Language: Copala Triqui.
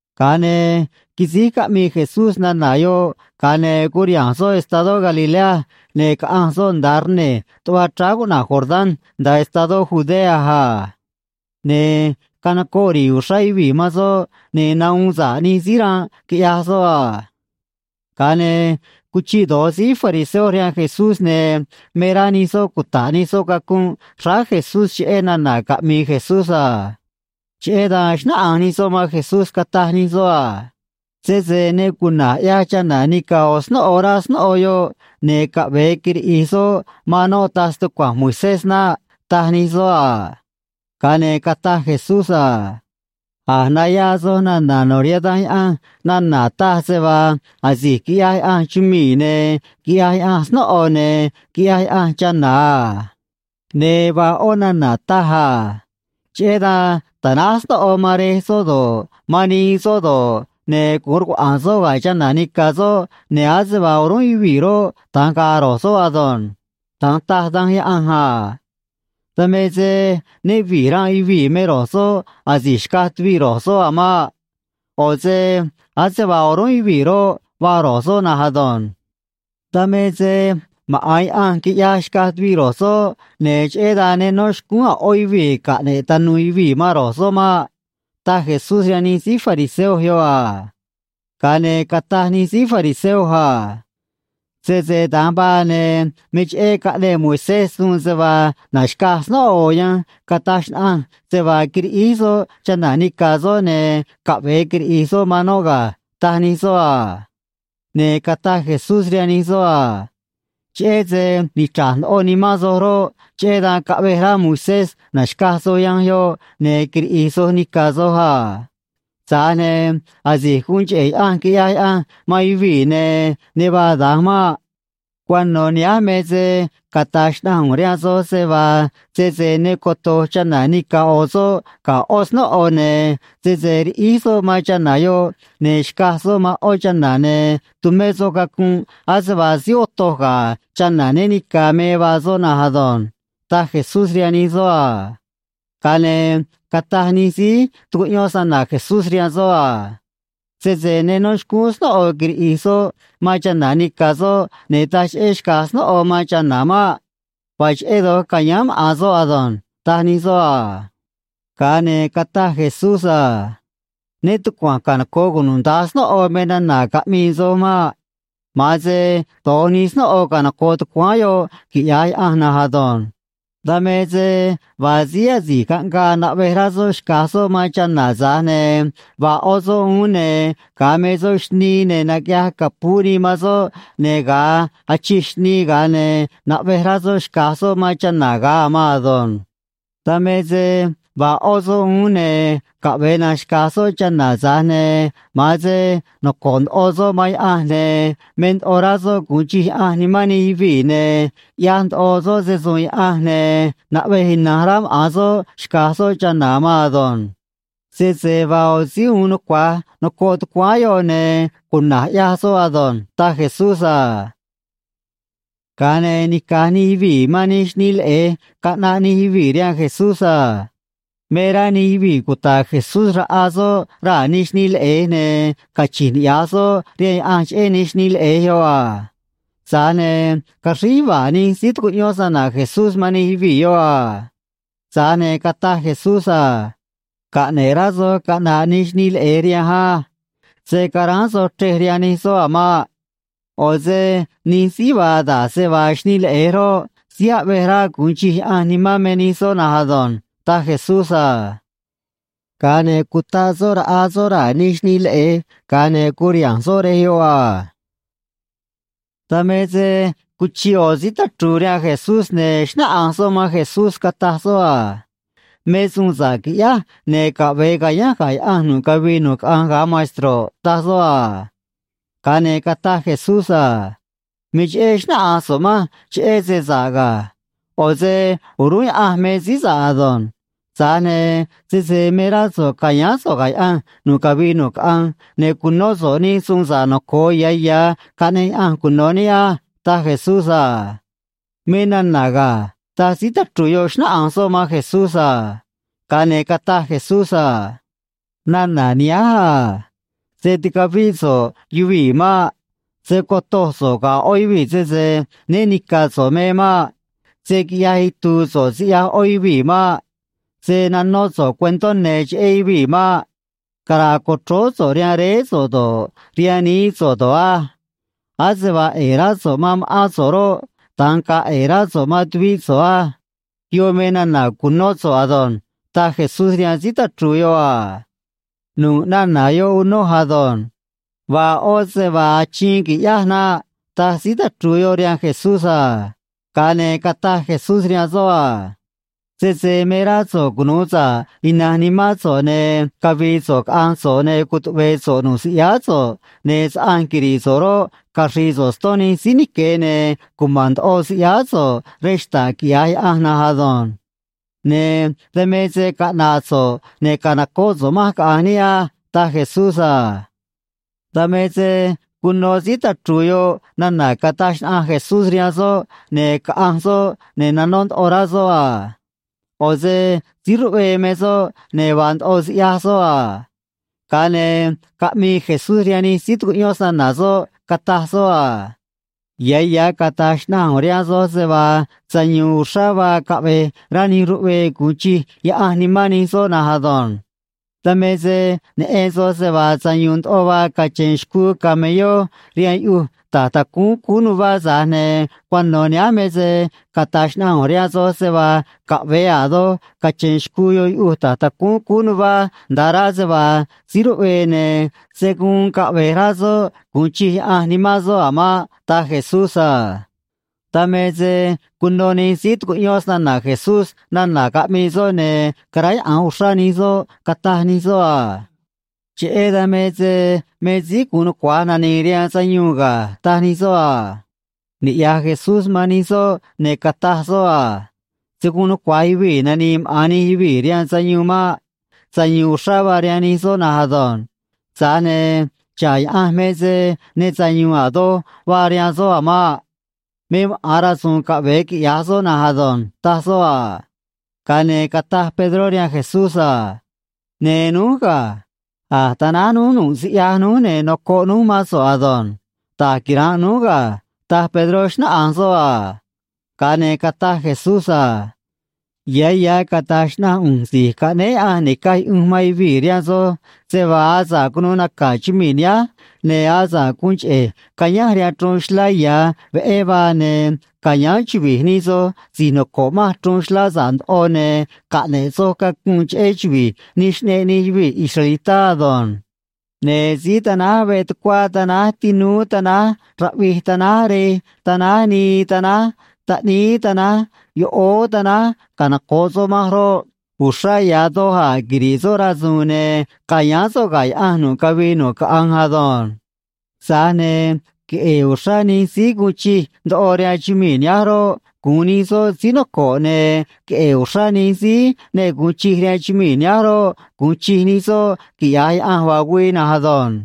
Ga̱a ne̱ quisíj caꞌmii Jesús nana̱ yoꞌ, ga̱a ne̱ curiha̱nj soꞌ estadó Galilea, ne̱ caꞌanj soꞌ nda̱a rne̱j tuꞌva chráá cuꞌna̱j Jordán, nda̱a estadó Judea a. Ne̱ canocoꞌ ri̱i̱ uxrá yuvii̱ man soꞌ, ne̱ nahuun sa̱ꞌ nij síí ranꞌ, quiꞌyaj soꞌ a. Ga̱a ne̱ cuchiꞌ do̱j síí fariseo rihaan Jesús, ne̱ me rá nij soꞌ cuta̱ꞌ nij soꞌ cacunꞌ xráá Jesús cheꞌé nana̱ caꞌmi̱i̱ Jesús a. Cheꞌé dan xnáꞌanj nij soꞌ man Jesús, cataj nij soꞌ a: ―Sese ne cuna̱j ꞌyaj chana̱ nica̱ ꞌo̱ snóꞌo, rá snóꞌo yoꞌ, ne̱ caꞌve̱e quiriꞌi̱j soꞌ man noꞌ taj stucua̱nj Moisés naꞌ ―taj nij soꞌ a. Ga̱a ne̱ cataj Jesús a: ―A̱j nayaa soj nana̱ no̱ rihaan Danj Yaꞌanj nana̱ taj se vaa asi̱j quiꞌyaj Yaꞌanj chumii̱, ne̱ quiꞌyaj Yaꞌanj snóꞌo, ne̱ quiꞌyaj Yaꞌanj chana̱ a. Ne̱ vaa ꞌó nana̱ taj a: “Cheꞌé dan ta̱náj snóꞌo man rej soꞌ do̱ꞌ, man nii soꞌ do̱ꞌ, ne̱ gu̱un rcuaꞌa̱a̱n soꞌ ga̱ chana̱ nica̱ soꞌ, ne̱ ase vaa o̱rúnꞌ yuvii̱ roꞌ, da̱nj ga̱a̱ ro̱j soꞌ ado̱nj.” Da̱nj taj Danj Yaꞌanj a. Dan me se né vi̱j ranꞌ yuvii̱ me ro̱j soꞌ asi̱j xcaj tuviꞌ ro̱j soꞌ a̱ maꞌ. ꞌO̱ se ase vaa o̱rúnꞌ yuvii̱ roꞌ, vaa ro̱j soꞌ na̱nj ado̱nj. Dan me se maꞌa̱n Yaꞌanj quiꞌyaj xcaj tuviꞌ ro̱j soꞌ, ne̱ cheꞌé dan ne nó xcúún a̱ ꞌó yuvii̱ caꞌne̱ꞌ tanu̱u̱ yuvii̱ man ro̱j soꞌ maꞌ ―taj Jesús rihaan nij síí fariseo yoꞌ a. Ga̱a ne̱ cataj nij síí fariseo a: ―Sese da̱nj vaa, ne̱ me cheꞌé caꞌneꞌ Moisés suun se vaa na̱xcaj snóꞌo ꞌo̱ yanj cataj xnaꞌanj se vaa quiriꞌíj soꞌ chana̱ nica̱ soꞌ, ne̱ caꞌve̱e quiriꞌi̱j soꞌ man noꞌ ga̱ ―taj nij soꞌ a. Ne̱ cataj Jesús rihaan nij soꞌ a: ―Cheꞌé se nichra̱j ndoꞌo nimán soj roꞌ, cheꞌé dan caꞌvej rá Moisés na̱xcaj soj yanj yoꞌ, ne̱ quiriꞌi̱j soj nica̱ soj a. Tza̱j ne̱ asi̱j guun cheꞌe̱ Yaꞌanj quiꞌyaj Yaꞌanj man yuvii̱, ne̱ ne vaa da̱nj maꞌ. Cuano̱ nihánj me se cata̱j xnaꞌanj ꞌu̱nj rihaan soj se vaa sese ne coto̱j chana̱ nica̱ ꞌo̱ soꞌ ga̱ ꞌó snóꞌo, ne̱ sese riꞌíj soꞌ man chana̱ yoꞌ ne̱ xcaj soꞌ man ꞌó chana̱, ne̱ tumé soꞌ cacunꞌ ase vaa síí otoj ga̱ chana̱ né ni̱ca̱ me vaa soꞌ na̱nj ado̱nj ―taj Jesús rihaan nij soꞌ a. Ga̱a ne̱ cataj nij síí tucuꞌyón snana̱ Jesús rihaan soꞌ a: ―Sese ne nó xcúún snóꞌo quiriꞌi̱j soꞌ man chana̱ nica̱ soꞌ, ne̱ taj cheꞌé xca̱j snóꞌo man chana̱ maꞌ. Vaa cheꞌé doj ca̱yáán maꞌa̱n soꞌ ado̱nj ―taj nij soꞌ a. Ga̱a ne̱ cataj Jesús a: ―Né tucua̱nj canoco̱ꞌ cunuda̱nj snóꞌo me nana̱ caꞌmii soj maꞌ. Ma̱an se do̱j nij snóꞌo canoco̱ꞌ tucuáán yoꞌ, quiꞌya̱j Yaꞌanj na̱nj ado̱nj. Dan me se vaa síí asi̱j caꞌngaa naꞌvej rá soꞌ xca̱j soꞌ man chana̱, tza̱j ne̱ vaa ꞌó soꞌ uún, ne̱ ga̱a me soꞌ xnii, ne̱ naquiꞌyaj capuú nii man soꞌ, ne̱ ga̱a achij xnii, ga̱a ne̱ naꞌvej rá soꞌ xca̱j soꞌ man chana̱ ga̱a a̱ maan ado̱nj. Dan me se vaa ꞌó soꞌ uún, ne̱ caꞌve̱e na̱nj xca̱j soꞌ chana̱, tza̱j ne̱ ma̱an se noco̱ꞌ ndoꞌo soꞌ man Yaꞌanj, ne̱ me ndoꞌo rá soꞌ gu̱un chij Yaꞌanj nimán nij yuvii̱, ne̱ ꞌyaj ndoꞌo soꞌ se‑su̱u̱n Yaꞌanj, ne̱ naꞌvej ina̱nj rá maꞌa̱n soꞌ xca̱j soꞌ chana̱ a̱ maan ado̱nj. Sese vaa ꞌo̱ síí uun nucua̱j noco̱ꞌ tucuáán yoꞌ, ne̱ cuna̱j ꞌyaj soꞌ ado̱nj ―taj Jesús a. Ga̱a ne̱ nica̱j nij yuvii̱ man nij xnii leꞌe̱j caꞌnaꞌ nij yuvii̱ rihaan Jesús a. Me rá nij yuvii̱ cuta̱ꞌ Jesús raꞌa soꞌ raa̱ nij xnii leꞌe̱j, ne̱ cachi̱nj niꞌya̱j soꞌ rihaan Yaꞌanj cheꞌé nij xnii leꞌe̱j yoꞌ a. Tza̱j ne̱ caxríj yuva̱a̱ nij síí tucuꞌyón snana̱ Jesús man nij yuvii̱ yoꞌ a. Tza̱j ne̱ cataj Jesús a: ―Caꞌne̱ꞌ rá soj caꞌna̱ꞌ nij xnii leꞌe̱j rihanj á. Se̱ caráán soj chrej rihaan nij soꞌ a̱ maꞌ. ꞌO̱ se nij síí vaa da̱j se vaa xnii leꞌe̱j roꞌ, síí aꞌvej rá gu̱un chij Yaꞌanj nimán me nij soꞌ na̱nj ado̱nj ―taj Jesús a. Ga̱a ne̱ cutaꞌ soꞌ raꞌa soꞌ raa̱ nij xnii leꞌe̱j, ga̱a ne̱ curiha̱nj soꞌ rej yoꞌ a. Dan me se cuchiꞌ ꞌo̱ síí tachru̱u̱ rihaan Jesús, ne̱ xnáꞌanj soꞌ man Jesús, cataj soꞌ a: ―Me suun sa̱ꞌ qui̱ꞌyáj, ne̱ caꞌve̱e ca̱yánj ga̱ Yaꞌanj nu̱ꞌ cavii nu̱ꞌ caꞌanj, ga̱a maestro̱ꞌ ―taj soꞌ a. Ga̱a ne̱ cataj Jesús a: ―Me cheꞌé xnáꞌanj so̱ꞌ manj cheꞌé se sa̱ꞌ ga̱. ꞌO̱ se o̱rúnꞌ Yaꞌanj me síí sa̱ꞌ ado̱nj. Tza̱j ne̱ sese me rá so̱ꞌ ca̱yáán so̱ꞌ ga̱ Yaꞌanj nu̱ꞌ cavii nu̱ꞌ caꞌanj, ne̱ cu̱nó so̱ꞌ nij suun noco̱o ya̱ ya̱ caꞌneꞌ Yaꞌanj cuno̱ níꞌ á ―taj Jesús a. ―Me nana̱ ga̱ ―taj síí tachru̱u̱ yoꞌ, xnáꞌanj soꞌ man Jesús a. Ga̱a ne̱ cataj Jesús a: ―Nana̱ nihánj a: “Se̱ ticavíꞌ so̱ꞌ yuvii̱ maꞌ. Se̱ cotoj so̱ꞌ ga̱ ꞌó yuvii̱ sese né ni̱ca̱ so̱ꞌ me maꞌ. Se̱ quiꞌyaj itu̱u̱ so̱ꞌ siꞌyaj ꞌó yuvii̱ maꞌ. Se̱ nanó so̱ꞌ cuentó ne̱ cheꞌé yuvii̱ maꞌ. Cara̱a̱ co̱chróó so̱ꞌ rihaan réé so̱ꞌ do̱ꞌ, rihaan nií so̱ꞌ do̱ꞌ á. Ase vaa ꞌe̱e̱ rá so̱ꞌ man ma̱ꞌán so̱ꞌ roꞌ, da̱nj ga̱a̱ ꞌe̱e̱ rá so̱ꞌ man tuvíꞌ so̱ꞌ á.” Yoꞌ me nana̱ cu̱nó so̱ꞌ ado̱nj ―taj Jesús rihaan síí tachru̱u̱ yoꞌ a. ―Nu̱ꞌ nana̱ yoꞌ unoj ado̱nj. Vaa ꞌó se vaa achiin qui̱ꞌyáj naꞌ ―taj síí tachru̱u̱ yoꞌ rihaan Jesús a. Ga̱a ne̱ cataj Jesús rihaan soꞌ a: ―Sese me rá so̱ꞌ cunu̱u sa̱ꞌ ina̱nj nimán so̱ꞌ, ne̱ cavi̱i̱ so̱ꞌ caꞌa̱nj so̱ꞌ, ne̱ cutuꞌve̱e̱ so̱ꞌ nu̱ꞌ siꞌyáá so̱ꞌ, ne̱ saꞌanj quiri̱ꞌ so̱ꞌ roꞌ, caxri̱i̱ so̱ꞌ ston nij síí nique̱, ne̱ cuma̱n ndoꞌo siꞌyáá so̱ꞌ rej xta̱ꞌ, quiꞌya̱j Yaꞌanj na̱nj ado̱nj. Ne̱ dan me se caꞌna̱ꞌ so̱ꞌ, ne̱ ca̱nocóꞌ so̱ꞌ manj, caꞌa̱nj níꞌ á ―taj Jesús a. Dan me se cuno síí tachru̱u̱ yoꞌ nana̱ cataj xnaꞌanj Jesús rihaan soꞌ, ne̱ caꞌanj soꞌ, ne̱ nanó ndoꞌo rá soꞌ a. ꞌO̱ se síí ruꞌvee me soꞌ, ne̱ vaa ndoꞌo siꞌyaj soꞌ a. Ga̱a ne̱ caꞌmii Jesús rihaan nij síí tucuꞌyón snana̱ soꞌ, cataj soꞌ a: ―Ya̱ ya̱ cata̱j xnaꞌanj ꞌu̱nj rihaan soj se vaa sayu̱u̱n uxrá vaa caꞌve̱j rá nij ruꞌvee gu̱un chij Yaꞌanj nimán nij soꞌ na̱nj ado̱nj. Dan me se neꞌen soj se vaa sayu̱u̱n ndoꞌo vaa cache̱n xcuu camelló rihaan yuꞌuj ta̱j tacúún cúú nuvá, tza̱j ne̱ cuano̱ nihánj me se cata̱j xnaꞌanj ꞌu̱nj rihaan soj se vaa caꞌve̱e a̱ doj cache̱n xcuu yoꞌ yuꞌuj ta̱j tacúún cúú nuvá, nda̱a rá se vaa síí ruꞌvee, ne̱ se̱ guun caꞌve̱j rá soꞌ gu̱un chij Yaꞌanj nimán soꞌ a̱ maꞌ ―taj Jesús a. Dan me se cuno nij síí tucuꞌyón snana̱ Jesús nana̱ caꞌmii soꞌ, ne̱ caráyaꞌa̱nj uxrá nij soꞌ, cataj nij soꞌ a: ―Cheꞌé dan me se me síí gu̱un nucua̱j nani̱i̱ rihaan sayuun ga̱ ―taj nij soꞌ a. Niꞌya̱j Jesús man nij soꞌ, ne̱ cataj soꞌ a: ―Se̱ guun nucua̱j yuvii̱ nani̱i̱ maꞌa̱n nij yuvii̱ rihaan sayuun maꞌ. Sayu̱u̱n uxrá vaa rihaan nij soꞌ na̱nj ado̱nj. Tza̱j ne̱ xa̱ꞌ Yaꞌanj me se ne sayu̱u̱n a̱ doj vaa rihaan soꞌ a̱ maꞌ. Me maꞌa̱n rasu̱u̱n caꞌve̱e quiꞌya̱j soꞌ na̱nj ado̱nj ―taj soꞌ a. Ga̱a ne̱ cataj Pedró rihaan Jesús a: ―Ne̱ núj ga̱. A̱j tanáj núj nu̱ꞌ siꞌyaj núj, ne̱ nocoꞌ núj mán so̱ꞌ ado̱nj. Da̱j quira̱nꞌ núj ga̱ ―taj Pedró, xnáꞌanj soꞌ a. Ga̱a ne̱ cataj Jesús a: ―Ya̱ ya̱ cata̱j xnaꞌanj ꞌu̱nj Si̱j Caꞌnéé Yaꞌanj Ni̱caj Yuꞌunj man Yuvii̱ rihaan soj se vaa asa̱ꞌ cunuu naca̱ chumii̱ nihánj, ne̱ asa̱ꞌ guun cheꞌe̱j cayánj rihaan chruun xlá ya̱ veꞌé vaa, ne̱ ca̱yáán chuvi̱j nij soj si̱j noco̱ꞌ manj chruun xlá sa̱ꞌ ndoꞌo, ne̱ caꞌne̱ꞌ soj cacunꞌ cheꞌé chuvi̱j nij xꞌneꞌ nij yuvii̱ israelitá ado̱nj. Ne̱ síí tanáj veꞌ tucuá tanáj tinúú tanáj raꞌvij tanáj rej tanáj nii tanáj taꞌníí tanáj yoꞌóó tanáj canoco̱ꞌ soꞌ manj roꞌ, uxrá ya̱ doj a̱ quiri̱ꞌ soꞌ rasu̱u̱n, ne̱ ca̱yáán soꞌ ga̱ Yaꞌanj nu̱ꞌ cavii nu̱ꞌ caꞌanj ado̱nj. Tza̱j ne̱ queꞌe̱e̱ uxrá nij síí guun chij ndoꞌo rihaan chumii̱ nihánj roꞌ, gu̱un nij soꞌ síí noco̱ꞌ, ne̱ queꞌe̱e̱ uxrá nij síí ne gu̱un chij rihaan chumii̱ nihánj roꞌ, gu̱un chij nij soꞌ, quiꞌya̱j Yaꞌanj vaa güii na̱nj ado̱nj.